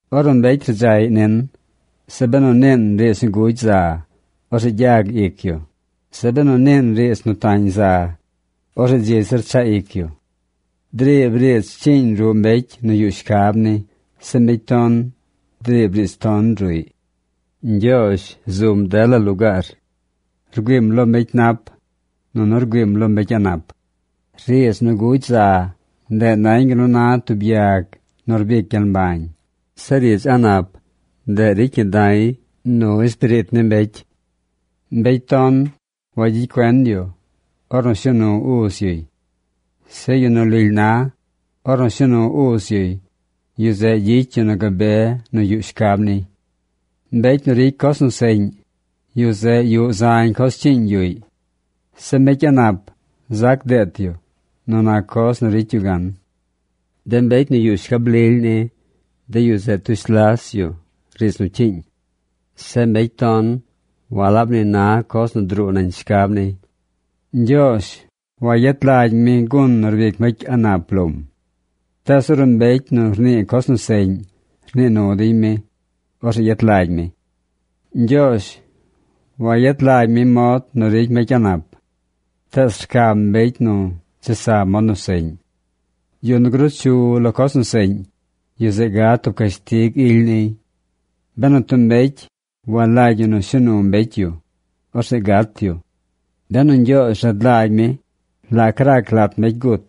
Ornu mbecy rdzaꞌy nin, zeꞌ benu niin riidz nu gugy za, orzeꞌ gyag ic yu. Zeꞌ benu niin riidz nu tañ za, orzeꞌ dzi zir chaꞌ ic yu. Driib riidz cyiiñ ruꞌ mbecy nu yuꞌ shcab ni. Zeꞌ mbecy ton driib riidz ton ruꞌy. Ñgyoozh zum dela lugaar. Rgüiim lo mbecy nap, nunu rgüiim lo mbecy a̱ꞌ nap. Riidz nu gugy za, ndeꞌ nañ gal nu na tub yag nu rbic gyel mbañ. Zeꞌ riidz a̱ꞌ nap, ndeꞌ ricy ñi da̱y nu espiriit ni mbecy. Mbecy ton wagyicy cuen yu ornu shuu nu uz yuy. Zeꞌ yu nu lily na, ornu shuu nu uz yuy, yu zeꞌ gyicy yu nu gabe nu yuꞌ shcab niy. Mbecy nu ricy coz nu seꞌñ, yu zeꞌ yuꞌ zañ coz cyiiñ yuꞌy. Zeꞌ mbecy a̱ꞌ nap zac deet yu nu nac coz nu ricy yu gan. De mbecy nu yuꞌ shcab lily ni, de yu zeꞌ tush las yu riidz nu cyiiñ. Zeꞌ mbecy ton walab ni na coz nu druu nañ shcab niy. Ñgyoozh wayet lagy mi gun nu rbic mbecy a̱ꞌ nap lom. Tees ornu mbecy nu rnii coz nu seꞌñ rnii nu dey mi, orzeꞌ yet lagy mi. Ñgyoozh wayet lagy mi mod nu ricy mbecy a̱ꞌ nap. Tees rcam mbecy nu chesa mod nu seꞌñ. Yu nu gruu chu lo coz nu seꞌñ, yu zeꞌ gad tub cashtig ily niy. Benu tub mbecy walagy yu nu shuu nu mbecy yu, orzeꞌ gat yu. Benu Ñgyoozh rad lagy mi la rac lat mbecy gut,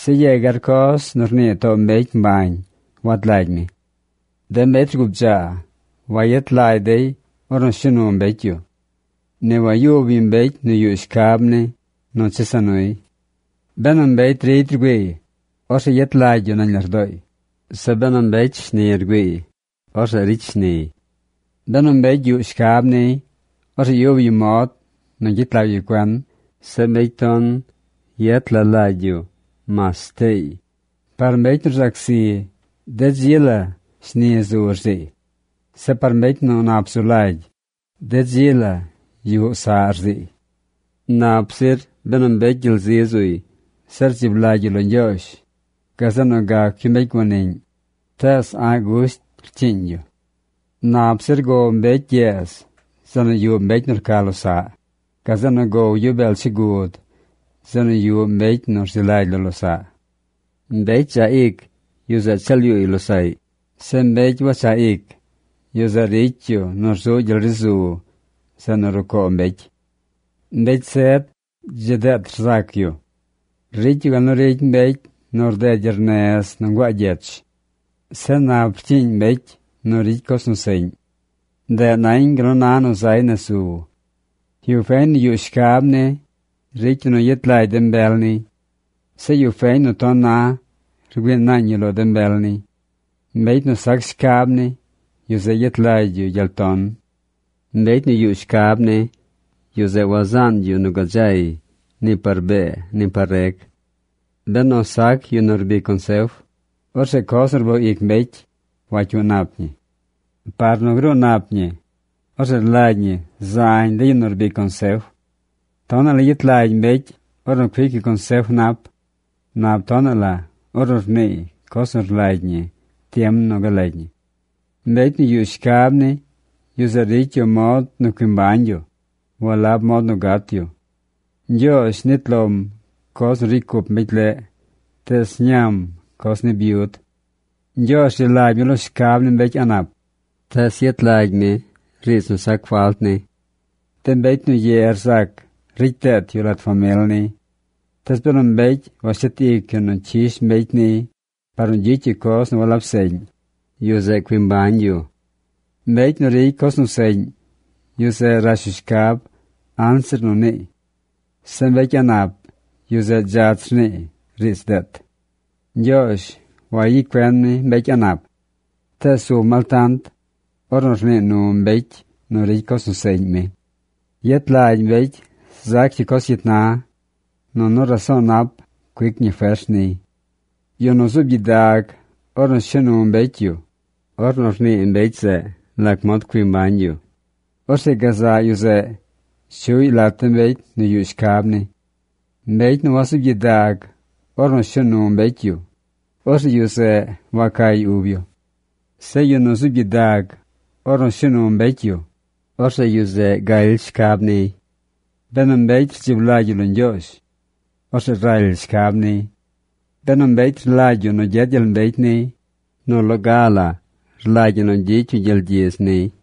se yegar coz nu rnii too mbecy mbañ wad lagy mi. De mbecy rgubdzaa wayet lagy dey ornu shuu nu mbecy yu. Ni wayub yu mbecy nu yuꞌ shcab ni chesa nuy. Benu mbecy rigy rgüiiy, orzeꞌ yet lagy yu nañ lardooy. Zeꞌ benu mbecy shni rgüiiy, orzeꞌ ricy shniy. Benu mbecy yuꞌ shcab niy, orzeꞌ yub yu mod nu gyet lag yu cuen. Zeꞌ mbecy ton yet la lagy yu mas shteey. Par mbecy nu rzac zi, de dzi la shni zu rziiy. Zeꞌ par mbecy nu nap zu lagy, de dzi la yuꞌ saꞌ rziiy. Nap zir benu mbecy gyel zi zuy, se rdzib lagy yu lo Ñgyoozh, gazeꞌ nu gac yu mbecy guaniꞌñ, tees a̱ꞌ gusht cyiiñ yu. Nap zir gow mbecy gyeez zeꞌ nu yuꞌ mbecy nu rca losaꞌ, gazeꞌ nu gow yu beel chigud zeꞌ nu yuꞌ mbecy nu rzi lagy lo losaꞌ. Mbecy dzaꞌ ic, yu zeꞌ cheel yuuy losaꞌy. Zeꞌ mbecy wachaꞌ ic, yu zeꞌ ricy yu nu rzuꞌ gyel ri zu zeꞌ nu rucoo mbecy. Mbecy zed dzi deet rzac yu. Ricy yu gal nu ricy mbecy nu rded gyernez nu nguaa gyech. Zeꞌ nap rcyiiñ mbecy nu ricy coz nu seꞌñ. Ndeꞌ nañ gal nu na nu zay nez zu. Yu feñ nu yuꞌ shcab ni, ricy yu nu yet lagy de mbel niy. Zeꞌ yu feñ nu ton na rgüii naañ yu lo de mbel niy. Mbecy nu sac shcab ni, yu zeꞌ yet lagy yu gyel ton. Mbecy nu yuꞌ shcab ni, yu zeꞌ wazaan yu nu gadzay ni par bee ni par reg. Benu sac yu nu rbic consef, orzeꞌ coz nu rboo ic mbecy wacyuu nap ñi. Par nu gruu nap ñi, orzeꞌ rlagy ñi zañ de yu nu rbic consef. Tonaꞌ la yet lagy mbecy ornu cuic yu consef nap. Nap tonaꞌ la ornu rniiy coz nu rlagy ñi tiem nu galagy ñi. Mbecy nu yuꞌ shcab ni, yu zeꞌ ricy yu mod nu cui mbañ yu, walab mod nu gat yu. Ñgyoozh nit lom coz nu ricy cup mbecy leꞌ. Tees ñam coz ni byud. Ñgyoozh rzi lagy mi lo shcab ni mbecy a̱ꞌ nap. Tees yet lagy mi riidz nu sac falt ni. De mbecy nu ye rzac ricy deet yu lat famil niy. Tees benu mbecy washet ic yu nu cyish mbecy niy par nu gyicy yu coz nu walab seꞌñ, yu zeꞌ cui mbañ yu. Mbecy nu ricy coz seꞌñ, yu zeꞌ rash yu shcab anzir nu niiy. Zeꞌ mbecy a̱ꞌ nap, yu zeꞌ dzach rniiy riidz deet. Ñgyoozh wayicy cuen mi mbecy a̱ꞌ nap. Tees zum altant ornu rnii nu mbecy nu ricy coz nu seꞌñ mi. Yet lagy mbecy zac yu coz cyit na. Nunu raso̱o̱ nap cuic ñi fers niy. Yu nu zuub gyidag ornu shuu nu mbecy yu, ornu rnii mbecy zeꞌ lac mod cui mbañ yu, orzeꞌ gazaꞌ yu zeꞌ chuꞌy lat de mbecy nu yuꞌ shcab ni. Mbecy nu wazuub gyidag ornu shuu nu mbecy yu, orzeꞌ yu zeꞌ wacay ub yu. Zeꞌ yu nu zuub gyidag ornu shuu nu mbecy, orzeꞌ yu zeꞌ galy shcab niy. Benu mbecy rdzib lagy yu lo Ñgyoozh, orzeꞌ raly shcab niy. Benu mbecy rlagy yu nu gyed gyel mbecy niy, nu loga la rlagy ñi nu gyicy yu gyel gyidz niy.